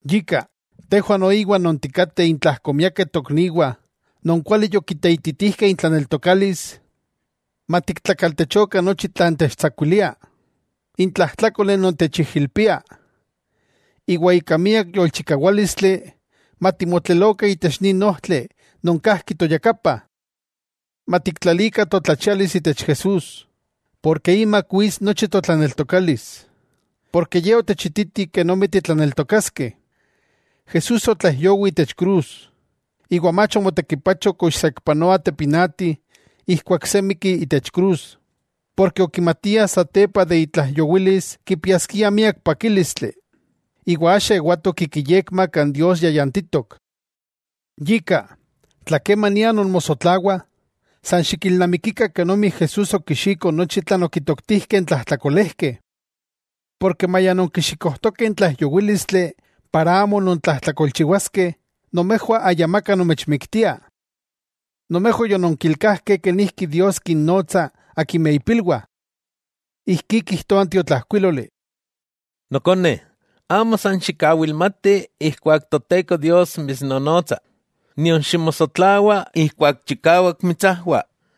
Yika, tejwah noiwah, non tikateh intlajko miakeh tokniwah non kuali yokiteititijkeh intlaneltokalis, matiktlakaltechokah nochi tlan techtsakuilia, n tlajtlákoli non techijilpia. Iwa ika miak yolchikawálistli matimotlelokah itech nin ojtli non kajki toyakapa. Matiktlalikah totlachialis itech Jesús, porke imak wits nochi totlaneltokalis, porke Ye otechititi kenomi titlaneltokaskeh. Jesús otlaijyowi itech krus, iwa mach omotekipacho kox saikpanoa tepinati ijkuak se mikki itech krus, porke okimatia satepa de itlaijyowilis kipiaskia miak pakílistli, iwa axa ewatok ik iyekma kan Dios yayantitok. Yika, tla kemania nonmosotlawah, san xikilnamikikah kenomi Jesús okixiko nochi tlan okitoktijkeh n tlajtlakolejkeh. Porke maya nonkixikojtokeh n tlaijyowílistli para amo nontlajtlakolchiwaskeh, nomejwah ayamaka nomechmiktia. Nomejwah yononkilkajkeh kenijki Dios kinnonotsa akimeh ipilwah. Ijkí kijtoa n tiotlajkuiloli: Nokone, amo san xikawilmati ijkuak Toteko Dios mitsnonotsa, nion ximosotlawa ijkuak chikawak mitsajwa.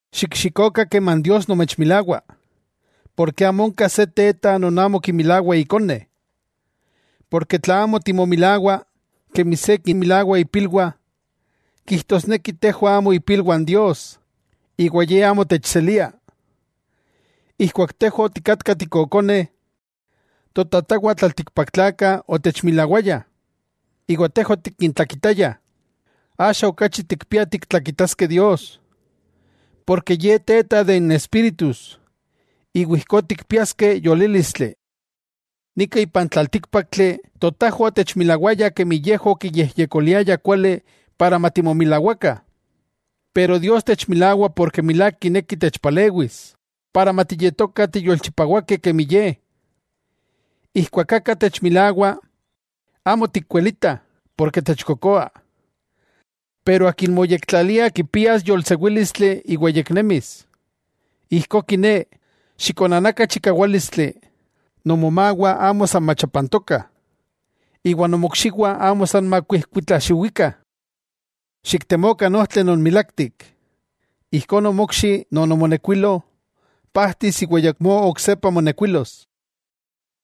Xikxikokah keman Dios nomechmilawa, porke amo onka se teta non amo kimilawa ikone. Porke tla amo timomilawah, kemi se kinmilawa ipilwah, kijtosneki tejwah amo ipilwah n Dios, iwa Ye amo techselia. Ijkuak tejwah otikatkah tikokoneh, totajwah tlaltikpaktlakah otechmilawayah, iwa tejwah otikintlakitayah. Axa okachi tikpiah tiktlakitaskeh Dios, ken Ye Teta de n espíritus, iwa ijkó tikpiaskeh yolílistli. Nika ipan tlaltíkpaktli totajwah otechmilawayah kemi yejwah okiyejyekoliayah kuali para matimomilawakah. Pero Dios techmilawah porke milák kineki techpalewis, para matiyetokah tiyolchipawakeh kemi Ye. Ijkuak aka techmilawa, amo tikwelitah, porke techkokoa. Pero akin moyektlalia kipias yolsewílistli iwa yeknemis. Ijkó kiné, xikonanakah chikawálistli, nomomawah amo san machapantokah, iwa nomokxiwah amo san makuijkuitlaxiwikah. Xiktemokah n ojtli milaktik. Ijkó, nomokxi non omonekuilo, pajtis iwa ayakmó oksepa monekuilos.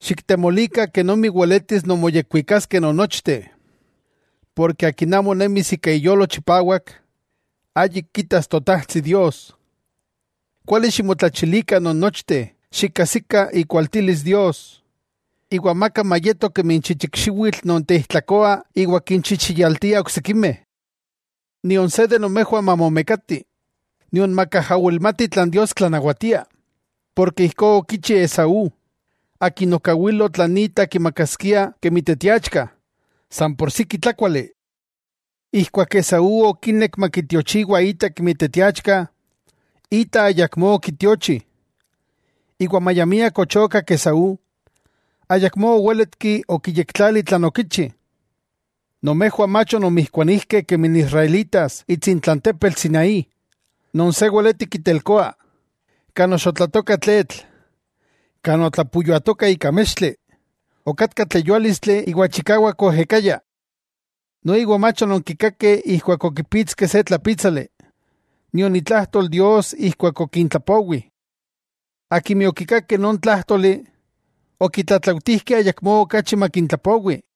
Xiktemolikah kenomi weletis nonmoyekwikaskeh non nochteh, akin amo nemis ika iyolo chipawak, ayik kitas Totajtsi Dios. Kuali ximotlachilikah nonnochteh xikajsikah ikualtilis Dios, iwa amaka mayeto kemi n chichik xiwitl non teijtlakoa iwa kinchichiyaltia oksikimeh. Nion se de nomejwah mamomekati, nion makajawilmati tlan Dios tlanawatia, porke ijkó okichi Esaú, akin okawilo tlan ita kimakaskia kemi teteachka, san por siki tlákuali. Ijkuak Esaú okinek makitiochiwa ita kemi teteachka, ita ayakmó okitiochi, iwa maya miak ochokak Esaú, ayakmó owéletki okiyektlali tlan okichi. Nomejwah mach ononmijkuanijkeh kemi n israelitas itsintla n tepetl Sinaí non se weleti kitelkoa, kan oxotlatoka tletl, kan otleyuatoka ika mextli, okatka tleyuálistli iwa chikawak oejekaya. Noiwa mach ononkikakeh ijkuak okipitskeh se tlapítsali, nion itlajtol Dios ijkuak okintlapowi. Akimeh okikakeh non tlájtoli, okitlatlautijkeh ayakmó okachi makintlapowi,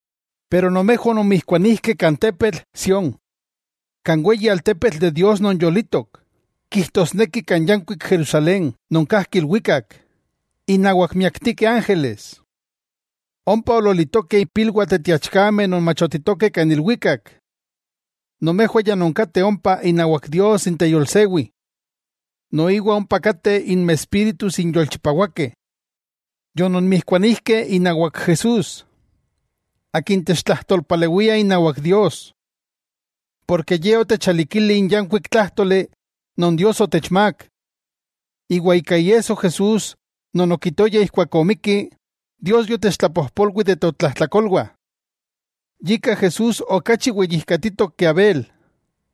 Pero nomejwah ononmijkuanijkeh kan tepetl Sión, kan weyi altepetl de Dios non yolitok, kijtosneki kan yankuik Jerusalén non kajki ilwikak, innawak miaktikeh ángeles, ompa ololitokeh ipilwah teteachkameh non machotitokeh kan ilwikak. Nomejwah ya nonkateh ompa inawak Dios n teyolsewi. Noiwa ompakateh inmespíritus n yolchipawakeh. Yononmijkuanijkeh inawak Jesús, Akin techtlajtolpalewia inawak Dios, porke Ye otechalikili n yankuik tlájtoli non Dios otechmák. Iwa ika iesso Jesús non okitoya ijkuak omikki, Dios yotechtlapojpolwi de totlajtlakolwah. Yika Jesús okachi weyijkatitok ke Abel,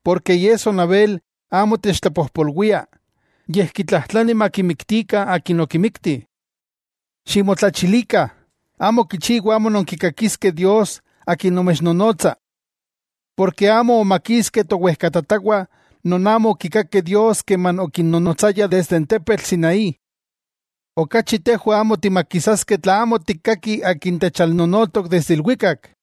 porke iesso n Abel amo techtlapojpolwia yej kitlajtlani makimiktikah akin okimikti. Ximotlachilikah, amo kichiwa amo nonkikakiskeh Dios Akin nomechnonotsa. Porke amo omakiskeh towejkatatawah non amo okikakeh Dios keman okinnonotsaya kan tepetl Sinaí. Okachi tejwah amo timakisaskeh tla amo tikkaki akin techalnonotok desde ilwikak.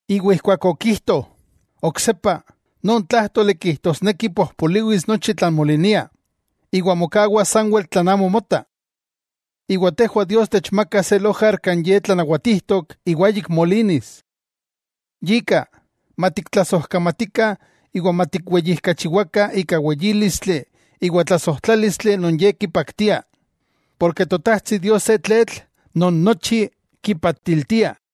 Iwa ijkuak okijto “oksepa”, non tlájtoli kijtosneki pojpoliwis nochi tlan molinia, iwa mokawas sanwel tlan amo mota. Iwa tejwah Dios techmaka se lojar kan Ye tlanawatijtok iwa ayik molinis. Yika, matiktlasojkamatikah iwa matikweyijkachiwakah ika weyílistli iwa tlasojtlálistli non Ye kipaktia, porke Totajtsi Dios se tletl non nochi kipaatiltia.